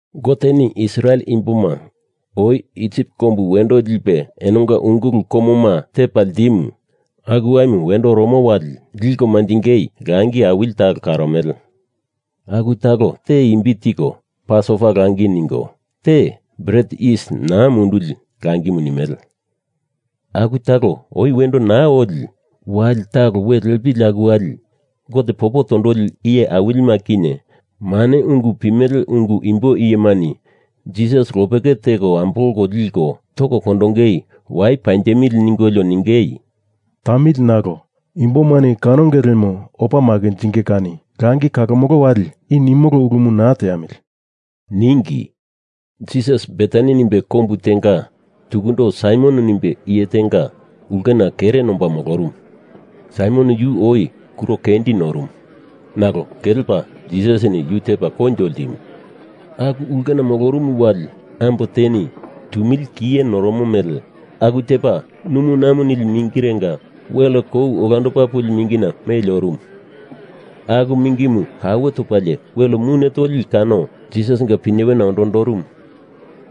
Goteni Israel imboma oi Isip kombu wendo lipe enonga ungulu komoma tepa ltimu aku waimu wendo oromo wali liko manjingei langi awili talo karomele. Aku talo te imbi tiko, Pasova langi ningo, te Bret Yis Naa Munduli langimu nimele. Aku talo oi wendo naa oli wali talo welepili aku wali Gote popo tondoli iye awilima kinye mane ungu pimeleungu imbo iyemani Jisas lopeke teko ambolko liko toko kondongei wai panjemili ningolio ningei, “Tamili nalo imbomani kanonge lemo opa makinjinge kani langi kalomolo wali i nimolo ulumu naa teamili,” ningi. Jisas Betani nimbe kombu tenga tukundo Saimon nimbe iye tenga ulkena kere nomba molorumu. Saimon yu oi kuro kendi norumu, nalo kelepa Jisasini yu tepa koinjo ltimu. Aku ulkena molorumu wali ambo teni tumili kiye noromo mele aku tepa numunamu nili mingirenga wel kou olandopa puli mingina meli orumu. Aku mingimu kawe topalie wel mune toli kano Jisasinga pinyewena ondondorumu.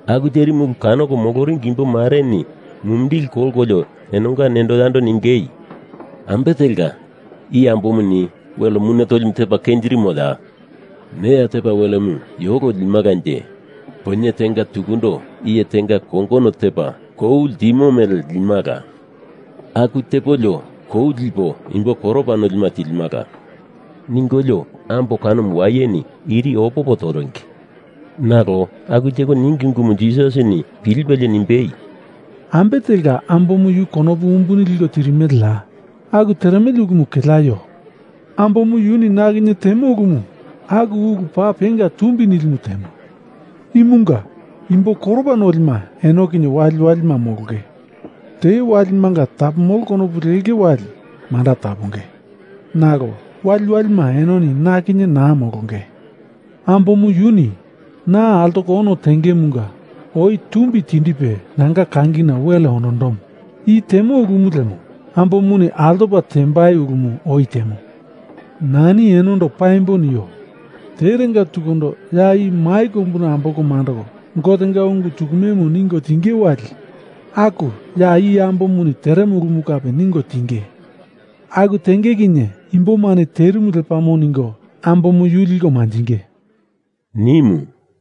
Aku terimu ulu kanoko moloringi imbo mareni mumindili kolkolio enonga nendo yando ningei, “Ambe telka i ambomuni wel mune tolimu tepa kenjirimoya? Neya tepa welemu yolo limalanje, poinye tenga tukundo iye tenga kongono tepa kou ltimo mele limala. Aku tepolio koumu lipo imbo koropa nolima tilimala,” ningolio ambo kanomu wayeni irini opopo toringi. Nalo aku teko ningi ungumu Jisasini pilipelie nimbei, “Ambe telka ambomu yu konopu umbuni liko tirimeleya? Aku teremele ulumu keleaio! Ambomu yuni na kinye temo ulumu, aku ulu paa penga tumbi nilimu temo. Imunga imbo koropa nolima eno kinye waliwalima molonge. Te walimanga tapomolo konopu lenge wali manda taponge. Nalo waliwalima enoni na kinye naa molonge. Ambomu yuni na altoko ono tengemunga oi tumbi tindipe nanga kangina wel ondondomo. I temo ulumu lemo ambomuni altopa tembai ulumu oi temo. Nani enondo paimbo nio. Terenga tukundo ya i mai kombuna ambolko mandoko Gotenga ungu tukumemu ningo tinge wali aku ya i ambomuni teremo ulumu kape ningo tinge. Aku tenge kinye imbomani terimu lepamo ningo ambomu yu liko manjinge,” nimu.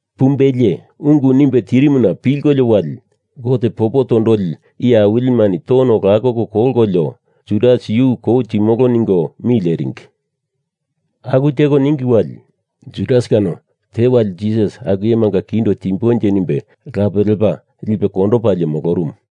Pumbelie ungu nimbe tirimuna pilkolio wali, Gote popo tondoli iye awilimani tono lakoko kolkolio, Judas yu kou timolo ningo mi leringi. Aku teko ningi wali, Judas kano Jisas tewali aku iyemanga kindo timbonje nimbe lape lepa lipe kondopalie molorumu.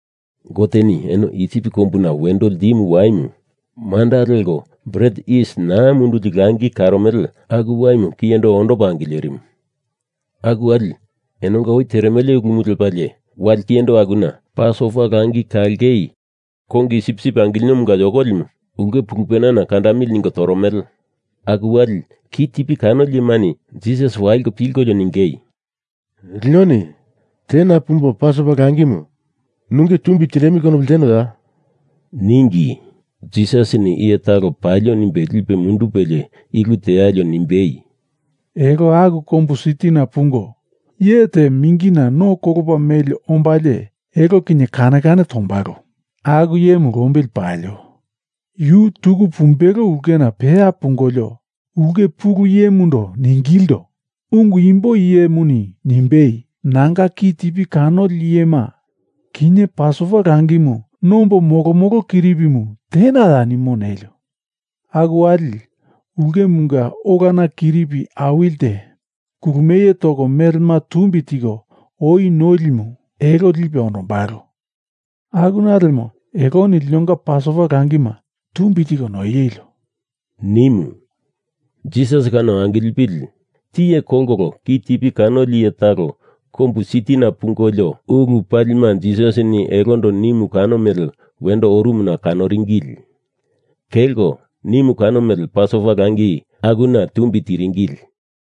Goteni eno Isip kombu wendo ltimu waimu manda leko Bret Yis Naa Munduli langi karomele aku waimu kiyendo ondopa angilerimu. Aku wali enonga oi teremele ulumu lepalie wali kiyendo akuna Pasova langi kalongei kongi sipsip angilinomunga yokolimu ulke pulupena kandamili ningo toromele. Aku wali kitipi kanoli iyemani Jisas waliko pilkolio ningei, “Linoni tena pumbo Pasova langimu nunge tumbi tindemili konopu ltenoya?” ningi. Jisasini iye talo palio nimbe lipe mundupelie i ulu tealio nimbei, “Elo aku kombu sitina pungo iye te mingina no kolopa meli ombalie elo kinye kane kane tombalo. Aku iyemu lombili palio. Yu tuku pumbelo ulkena peya pungolio, ulke pulu iyemundo ningilindo, ‘Ungu imbo iyemuni nimbei, nanga kitipi kanoli iyema kinye Pasova langimu nombo molomolo kiripimu tenaya, nimo,’ nelio. Aku wali, ulkemunga olana kiripi awilite kulumie toko melema tumbi tiko oi noilimu elo lipe ondombalo. Akuna lemo eloni linonga Pasova langima tumbi tiko noielio,” nimu. Jisas kano angilipili tiye kolkolo kitipi kanoli iye taloni kombu sitina pungolio ulu palima Jisasini elondo nimu kano mele wendo orumuna kanoringili. Kelko nimu kano mele Pasova langi akuna tumbi tiringili.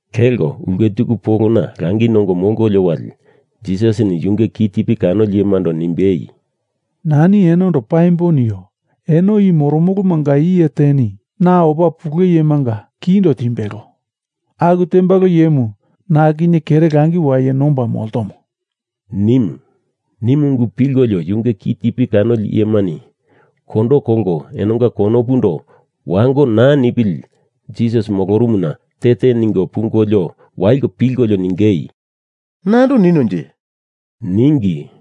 Kelko ulke tuku polona langi nongo molkolio wali Jisasini yunge kitipi kanoli iyemando nimbei, “Nani enondo paimbo nio. Eno i moromolomanga iye teni na opa pule iyemanga kindo timbelo. Aku tembalo iyemu na kinye kere langi waye nomba moltomo,” nimu. Nimu ungu pilkolio yunge kitipi kanoli iyemani kondo kolko enonga konopundo wango naa nipili Jisas molorumuna te te ningo pungolio waliko pilkolio ningei, “Nando ninonje,” ningi.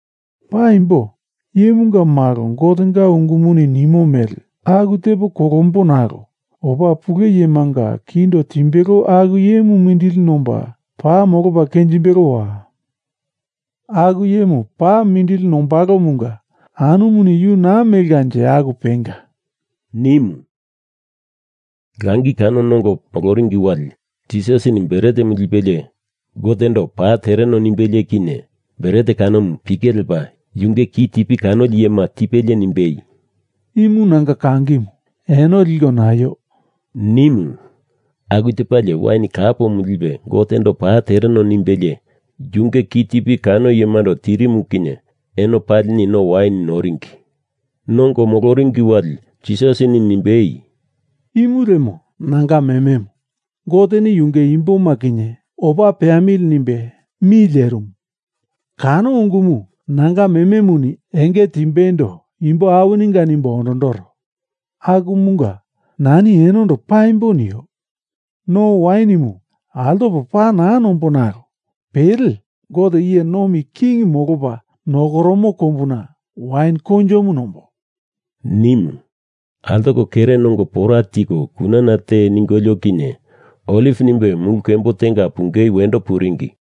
Paimbo Iyemunga Malo Gotenga ungumuni nimo mele aku tepo kolombo nalo opa pule iyemanga kindo timbelo aku iyemu mindili nomba paa molopa kenjimbelowa! Aku iyemu paa mindili nombalomunga anumuni yu naa melkanje aku penga!” nimu. Langi kano nongo moloringi wali, Jisasini bretemu lipelie Gotendo paa tereno nimbelie kinye, bret kanomu pike lepa yunge kitipi kanoli iyema tipelie nimbei, “Imu nanga kangimu eno liko naio,” nimu. Aku tepalie wain kapomu lipe Gotendo paa tereno nimbelie yunge kitipi kano iyemando tirimu kinye eno palini no wain noringi. Nongo moloringi wali Jisasini nimbei, “Imu lemo nanga mememu. Goteni yunge imboma kinye opa peamili nimbe mi lerimu kano ungumu nanga mememuni enge timbeindo imbo awininga nimbo ondondoro. Akumunga nani enondo paimbo nio. No wainimu altopo paa naa nombo nalo pele Gote iye nomi king molopa nokoromo kombuna wain koinjomu nombo,” nimu. Altoko kere nongo pora tiko kunana te ningolio kinye Oliv nimbe mulu kembo tenga pungei wendo puringi.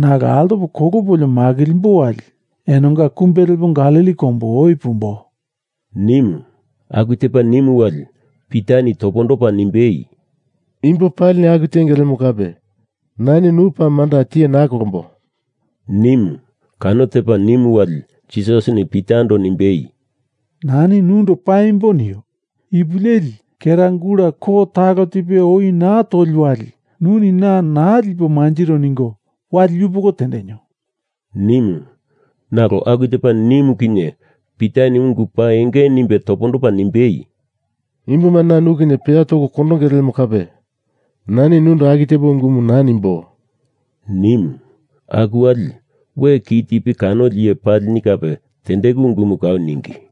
Nalo altopo kolopolio makilimbo wali enonga kumbe lepo Galili kombu oi pumbo,” nimu. Aku tepa nimu wali, Pitani topondopa nimbei, “Imbo palini aku tenge lemo kape nani nu paa manda tiye naa kolombo,” nimu. Kano tepa nimu wali, Jisasini Pitando nimbei, “Nani nundo paimbo nio. Ipu leli kera gula ko talo tipe oi naa toli wali, nuni na naa lipo manjiro ningo wali yupoko tendenio,” nimu. Nalo aku tepa nimu kinye Pitani ungu paa enge nimbe topondopa nimbei, “Imbomani na nu kinye peya toko kondonge lemo kape nani nundo aku tepo ungumu naa nimbo,” nimu. Aku wali, we kitipi kanoli iye palini kape tendeku ungumu kau ningi.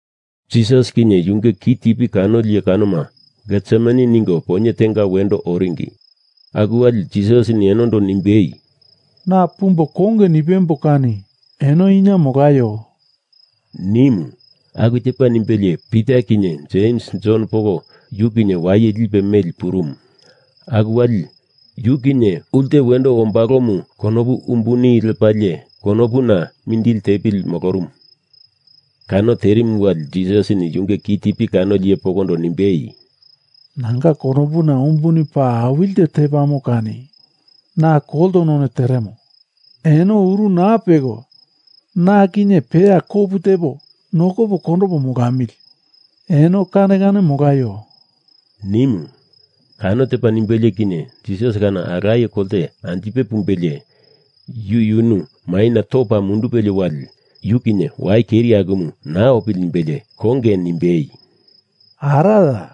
Jisas kinye yunge kitipi kanoli iye kanoma Getsemani ningo poinye tenga wendo oringi. Aku wali Jisasini enondo nimbei, “Na pumbo konge nipembo kani eno ina molaio,” nimu. Aku tepa nimbelie Pita kinye Jems Jon poko yu kinye waye lipe meli purumu. Aku wali yu kinye ulte wendo ombalomu konopu umbuni lepalie konopuna mindili tepili molorumu. Kano terimu wali Jisasini yunge kitipi kanoli iye pokondo nimbei, “Nanga konopuna umbuni paa awili te tepamo kani na kolto none teremo. Eno uru naa peko na kinye peya kopu tepo nokopo kondopo molamili, eno kane kane molaio,” nimu. Kano tepa nimbelie kinye Jisas kano alaye kolte anjipe pumbelie yuyunu maina topa mundupelie wali yu kinye wai keri akumu naa opili nimbelie konge nimbei, “Araya!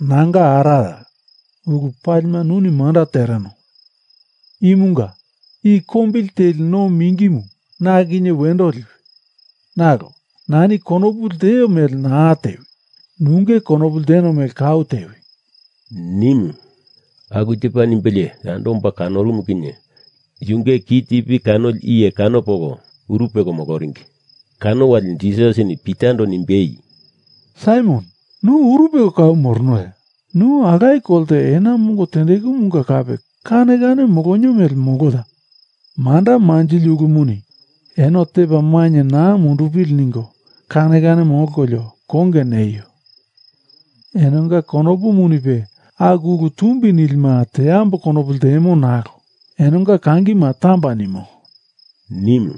Nanga araya! Ulu palima nuni manda tereno. Imunga i kombili teli no mingimu na kinye wendo liwi, nalo nani konopu lteo mele naa tewi. Nunge konopu lteno mele kau tewi,” nimu. Aku tepa nimbelie yando omba kanorumu kinye yunge kitipi kanoli iye kano poko uru peko moloringi. Kano wali Jisasini Pitando nimbei, “Saimon nu uru peko kau moronoya? Nu alaye kolte ena mongo tendekumunga kape kane kane molonio mele moloya? Manda manjili ulumuni eno tepa mainye naa mundupili ningo kane kane molkolio konge neio. Enonga konopumunipe aku ulu tumbi nili teambo konopu ltemo nalo enonga kangima tamba nimo,” nimu.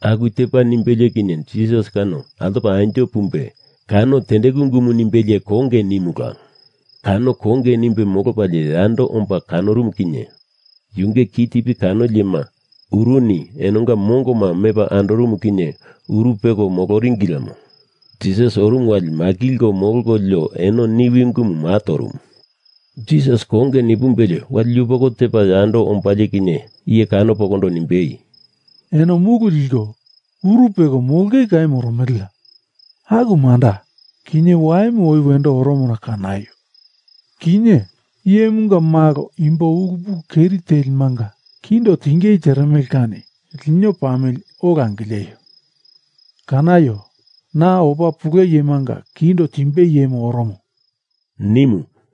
Aku tepa nimbelie kinye Jisas kano altopala anjo pumbe kano tendeku ungumu nimbelie konge nimula. Kano konge nimbe molopalie yando omba kanorumu kinye, yunge kitipi kanoli iyema uruni enonga mongoma mepa andorumu kinye uru peko moloringi lemo. Jisas orumu wali makilko molkolio eno niwi ungumu maa torumu. Jisas konge nipumbelie wali yupoko tepa yando ombalie kinye iye kano pokondo nimbei, “Eno mulu liko uru peko molongei kau moromeleya? Aku manda, kinye waimu oi wendo oromona kanaio. Kinye Iyemunga Malo imbo ulu pulu keri telimanga kindo tingei teremele kani lino pamili, ola angileio. Kanaio. Na opa pule iyemanga kindo timbei iyemu oromo,” nimu.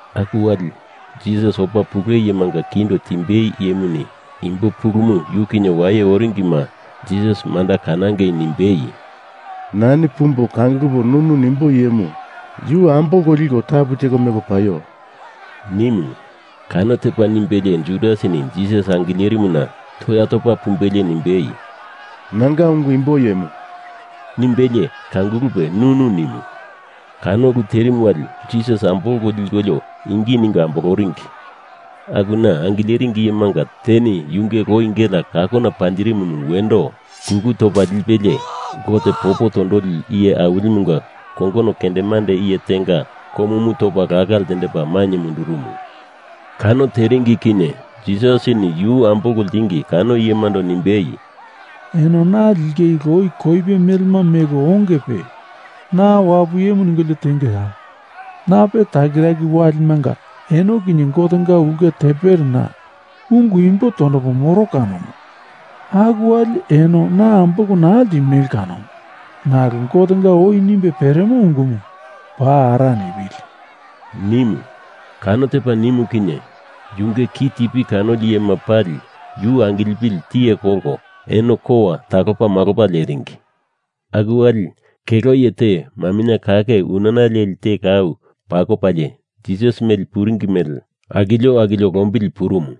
Aku wali, Jisas opa pule iyemanga kindo timbei iyemuni imbo pulumu yu kinye waye oringima Jisas manda kanangei nimbei, “Nani pumbo kangulupo nunu nimbo iyemu yu ambolko liko tapu teko meko paio,” nimu. Kano tepa nimbelie Judasini Jisas angilerimuna toya topa pumbelie nimbei, “Nanga ungu imbo iyemu!” nimbelie kangulupe nunu nimu. Kano ulu terimu wali Jisas ambolko likolio ingi ningo amboloringi. Akuna angileringi iyemanga teni yunge loi gelea kakona panjirimumu wendo kulu topa lipelie Gote popo tondoli iye awilimunga kongono kendemande iye tenga komumu topa laka ltendepa mainye mundurumu. Kano terimu kinye Jisasini yu ambolko ltingi kano iyemando nimbei, “Eno na lingei loi koipe melema meko ongepe, na wapu iyemu ningolio tengeya? Nape takiraki walimanga eno kinye Gotenga ulke tempelena ungu imbo tondopa moro kanomu. Aku wali eno na ambolko naa ltimele kanomu. Nalo Gotenga oi nimbe peremo ungumu paa ara nipili,” nimu. Kano tepa nimu kinye, yunge kitipi kanoli iyema pali yu angilipili tiye kolko eno kowa talopamalopa leringi. Aku wali kelo iye te maminye kake unana leli te kau pakopalie Jisas meli puringi mele akilio akilio lombili purumu.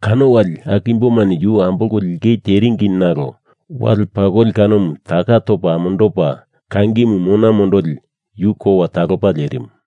Kano wali aku imbomani yu ambolko lingei teringi, nalo wale pakoli kanomu taka topa amondopa kangimu mona mondoli yu kowa talopa lerimu.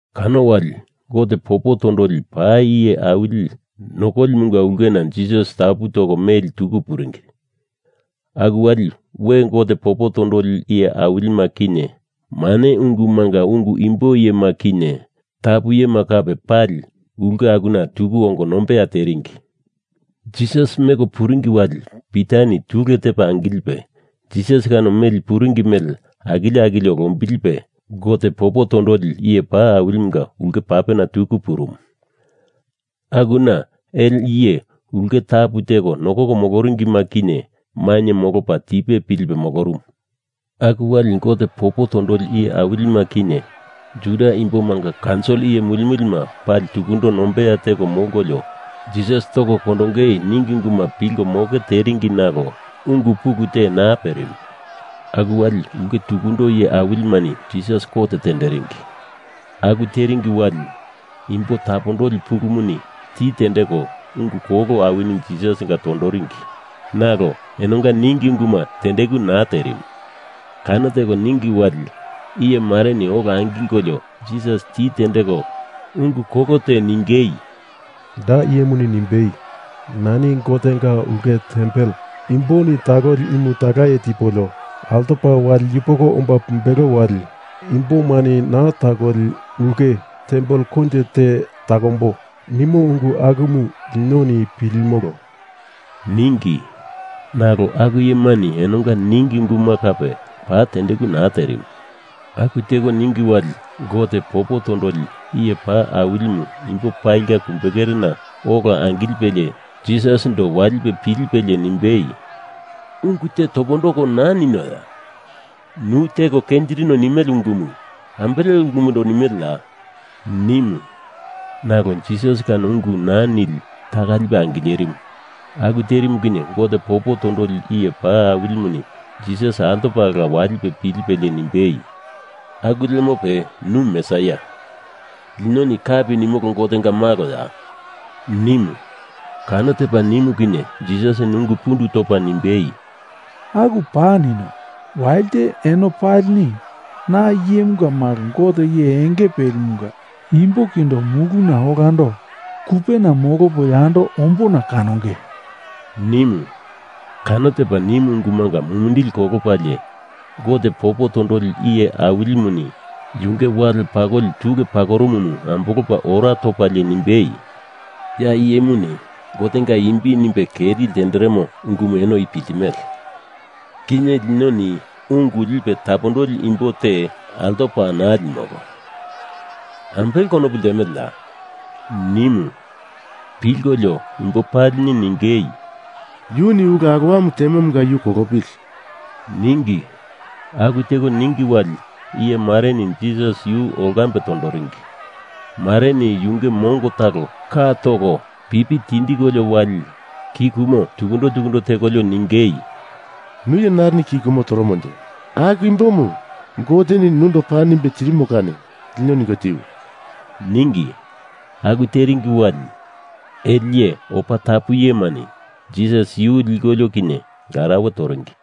Kano wali Gote popo tondoli paa iye awili nokolimunga ulkena Jisas tapu toko meli tuku puringi. Aku wali we Gote popo tondoli iye awilima kinye mane ungumunga ungu imbo iyema kinye tapu iyema kape pali ulke akuna tuku ongo nombeya teringi. Jisas meko puringi wali Pitani tule tepa angilipe Jisas kano meli puringi mele akilio akilio lombilipe Gote popo tondoli iye paa awilimunga ulke papena tuku purumu. Akuna ele iye ulke tapu teko nokoko moloringima kinye mainye molopa tipe pilipe molorumu. Aku wali Gote popo tondoli iye awilima kinye Juda imbomanga kaunsil iye mulimulima pali tukundo nombeya teko molkolio Jisas toko kondongei ningi ungumanga pilko moke teringi nalo ungu pulu te naa perimu. Aku wali ulke tukundo iye awilimani Jisas kot tenderingi. Aku teringi wali, imbo tapondoli pulumuni ti tendeko ungu kolo awini Jisasinga tondoringi, nalo enonga ningi unguma tendeku naa terimu. Kano teko ningi wali iye mareni ola angilkolio Jisas ti tendeko ungu kolo te ningei, “Da iyemuni nimbei, ‘Nani Gotenga ulke tempel imboni takoli imu talaye tipolio altopa wali yupoko omba pumbelo wali imbomani naa takoli ulke tempel koinjo te takombo,’ nimo ungu akumu linoni pilimolo,” ningi. Nalo aku iyemani enonga ningi unguma kape paa tendeku naa terimu. Aku teko ningi wali Gote popo tondoli iye paa awilimu imbo palinga kumbekerena ola angilipelie Jisasindo walipe pilipelie nimbei, “Ungu te topondoko naa ninoya? Nu teko kenjirino nimele ungumu ambele ulumundo nimeleya?” nimu. Nalo Jisas kano ungu naa nili taka lipe angilerimu. Aku terimu kinye Gote popo tondoli iye paa awilimuni Jisas altopala walipe pilipelie nimbei, “Aku lemope nu Mesaia, linoni kapi nimolo Gotenga maloya?” nimu. Kano tepa nimu kinye Jisasini ungu pundu topa nimbei, “Aku paa nino. Walite eno palini na iyemunga malo Gote iye enge pelimunga imbo kindo muluna olando kupena molopo yando ombona kanonge,” nimu. Kano tepa nimu ungumunga mumindili kolopalie Gote popo tondoli iye awilimuni yunge wale pakoli tule pakorumumu ambolopa ora topalie nimbei, “Ya iyemuni Gotenga imbi nimbe keri ltenderemo ungumu enoni i piltimele. Kinye linoni ungu lipe tapondoli imbo te altopa naa limolo. Ambele konopu ltemeleya?” nimu. Pilkolio imbo palini ningei, “Yuni ulu alowamu temomunga yu kolopili,” ningi. Aku teko ningi wali iye mareni Jisas yu olkambe tondoringi. Mareni yunge mongo talo ka toko pipi tindikolio wali ki kumo tukundo tukundo tekolio ningei, “Nu iye narini ki kumo toromonje aku imbomu Goteni nundo paa nimbe tirimo kani lino ningo tiwi!” ningi. Aku teringi wali ele iye opa tapu iyemani Jisas yu likolio kinye larauwe toringi.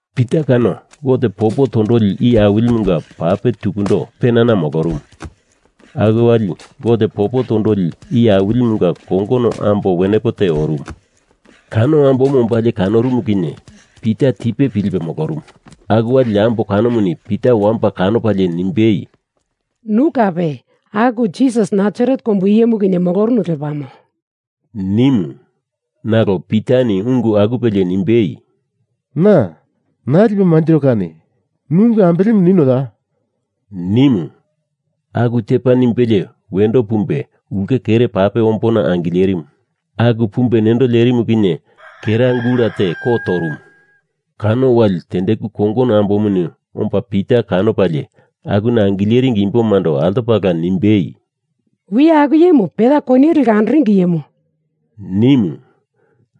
Pita kano Gote popo tondoli iye awilimunga pape tukundo penana molorumu. Aku wali Gote popo tondoli iye awilimunga kongono ambo wenepo te orumu. Kano ambomu ombalie kanorumu kinye Pita tipe pilipe molorumu. Aku wali ambo kanomuni Pita wamba kanopalie nimbei, “Nu kape aku Jisas Nasaret kombu iyemu kinye molorunu lepamo,” nimu. Nalo Pitani ungu akupelie nimbei, “Na naa lipo manjiro kani nu ungu ambelemu ninoya?” nimu. Aku tepa nimbelie wendo pumbe ulke kere pape ombona angilerimu. Aku pumbe nendo lerimu kinye kera gula te ko torumu. Kano wali tendeku kongono ambomuni omba Pita kanopalie akuna angileringi imbomando altopala nimbei, “Wiya aku iyemu peya koniye leko andoringi iyemu,” nimu.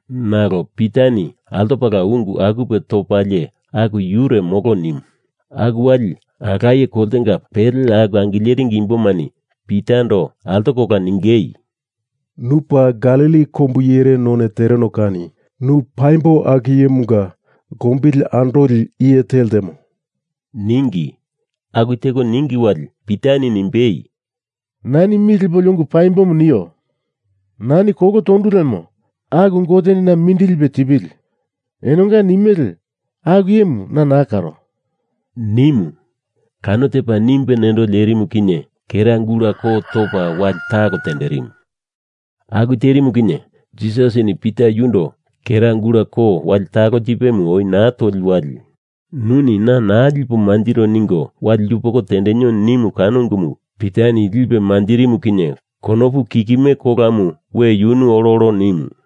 Nalo Pitani altopala ungu akupe topalie aku yure molo nimu. Aku wali alaye koltenga pele akuna angileringi imbomani Pitando altokola ningei, “Nu paa Galili kombu iyere none tereno kani nu paimbo aku iyemunga lombili andoli iye te ltemo,” ningi. Aku teko ningi wali Pitani nimbei, “Nani mi lepolio ungu paimbomu nio! Nani kolo tondu lemo aku Goteni na mindili lipe tipili. Enonga nimele aku iyemu na naa karo,” nimu. Kano tepa nimbe nendo lerimu kinye kera gula ko topa wali talo tenderimu. Aku terimu kinye Jisasini Pita yundo kera gula ko wali talo tipemu oi naa toli wali, nuni na naa lipo manjiro ningo wali yupoko tendenio nimu kano ungumu Pitani lipe manjirimu kinye konopu kikime kolamu we yunu ololo nimu.